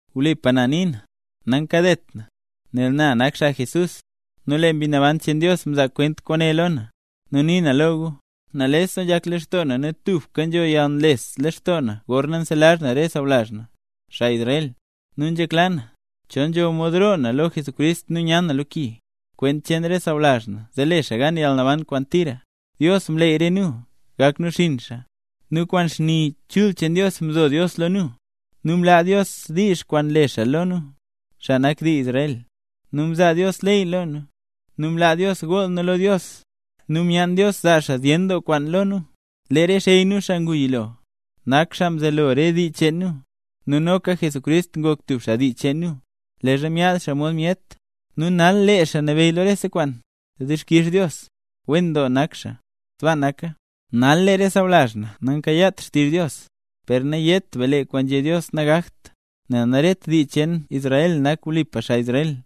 Wlipa na nii na, nankadet na, nel na nak xaa Jesús, nu lee Mbi Naban cheen Dios mzaa kwent kwaane lo na. Nu nii na lo gu, nales doo nzhak lextoo na nu tubka nzho yalnles lextoo na gorna nselazh na re sawlazh na, xaa Israel. Nu nzhekla na, chol nzho mod roo na lo Jesucrist nu nya na lo ki, kwent cheen sawlazh na zee le xaa gan yalnaban kwaan tira. Dios mleey re nu gak nu xinn xaa, nu kwaan xni chul cheen Dios mzo Dios lo nu, nu mlaa Dios diizh kwaan le xaa lo nu, xaa nak dii Israel, nu mzaa Dios ley lo nu, nu mlaa Dios gool nu lo Dios, nu myaan Dios zaa xaa zyen doo kwaan lo nu. Lee re xey nu, xaa ngu yilo, nak xaa mzelo re dii cheen nu; nu noka Jesucrist ngok tub xaa dii cheen nu, leezha myaad xaa mod myet, nu nal lee xaa nabeyy lo rese kwaan. ¡Dixkix Dios, wen doo nak xaa! ¡Sbaa naka! Nal lee re xaa sawlazh na nankayaat xtizh Dios, per nayét be lee kwaan nzhé Dios nagakt. Nel naret dii cheen Israel nak wlipa xaa Israel.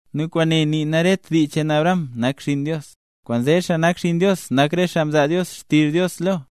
Nu kwaane nii na naret dii cheen Abraham nak xinn Dios. Kwaanzee xaa nak xinn Dios nak re xaa mzaa Dios xtizh Dios lo.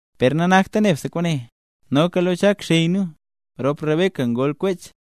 Per nanakta nebse kwaane. Noka lo Chak, xey nu, rop Rebek ngol kwech.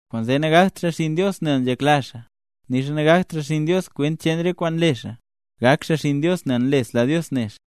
Kwaanzee nagakt xaa xinn Dios nel nzhekla xaa, nixa nagakt xaa xinn Dios kwent cheen re kwaan nle xaa, gak xaa xinn Dios nel nlesla Dios ne xaa.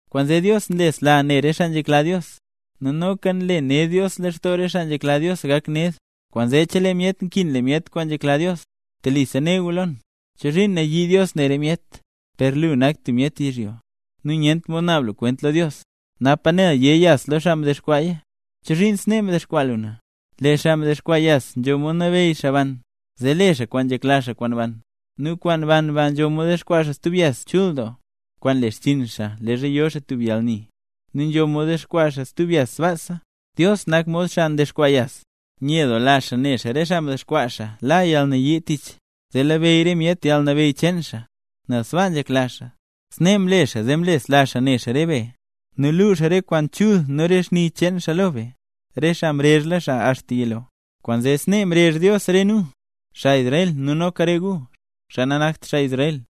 Kwaanzee Dios nlesla ne xaa re xaa nzhekla Dios, nu noka nle ned Dios lextoo re xaa nzhekla Dios gak ned. Kwaanzee chelee myet nkin le myet kwaan nzhekla Dios, telisa né gu lo na: “¿Chozhiin nayii Dios ne re myet?” Per lu nak tub myet yizhyo, nu nyent mod naab lu kwent lo Dios. Napa nel yé yas lo xaa mdexkwaaya, “¿Chozhiin snee mdexkwaa lu na?” Lee xaa ndexkwaa yas nzho mod nabeyy xaa ban, zee le xaa kwaan nzhekla kwaan ban; nu kwaan ban nzho mod dexkwaa xaa tub yas chul doo, kwaan le xchiin xaa leezha yo xaa tub yalni, nu nzho mod dexkwaa xaa stub yas sbaasa. Dios nak mod xaa ndexkwaa yas. Nyedoola xaa ne xaa re xaa mdexkwaa xaa la yalnayii tich, zee labeyy re myet yalnabeyy cheen xaa, nel sbaa nzhekla xaa. Snee mle xaa zee nzho mod mlesla xaa ne xaa re be, nu luu xaa re kwaan chul nu re xni cheen xaa lo be, re xaa mrezhla xaa axta yilo. Kwaanzee snee mrezh Dios rese nu, xaa Israel nu noka re gu, xaa nanakt xaa Israel.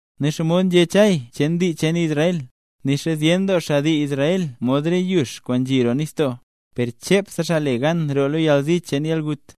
Nu xomod nzhé Chay cheen dii cheen Israel: “Nixa zyen doo dii xaa Israel mod re yux kwaan nzhi roo nistoo, per chepse xaa le gan roo lo yalzi cheen yalgut.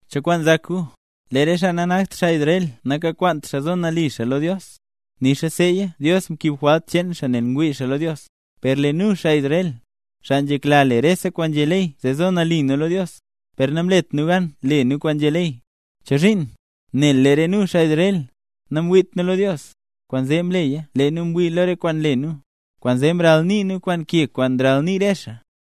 ¿Cho kwaan nzak gu? Lee re xaa nanakt xaa Israel nakakwaant xaa zo nali xaa lo Dios, nixa seeya Dios mkiib jwalt cheen xaa nel ngwii xaa lo Dios. Per lee nu, xaa Israel, xaa nzhekla le rese kwaan nzhé ley zee zo nali nu lo Dios, per namlet nu gan le nu kwaan nzhé ley. ¿Chozhiin? Nel lee re nu, xaa Israel, namwiit nu lo Dios, lee nu mwii lo re kwaan nle nu. Kwaanzee mralnii nu kwaan “ke kwaan nralnii re xaa”.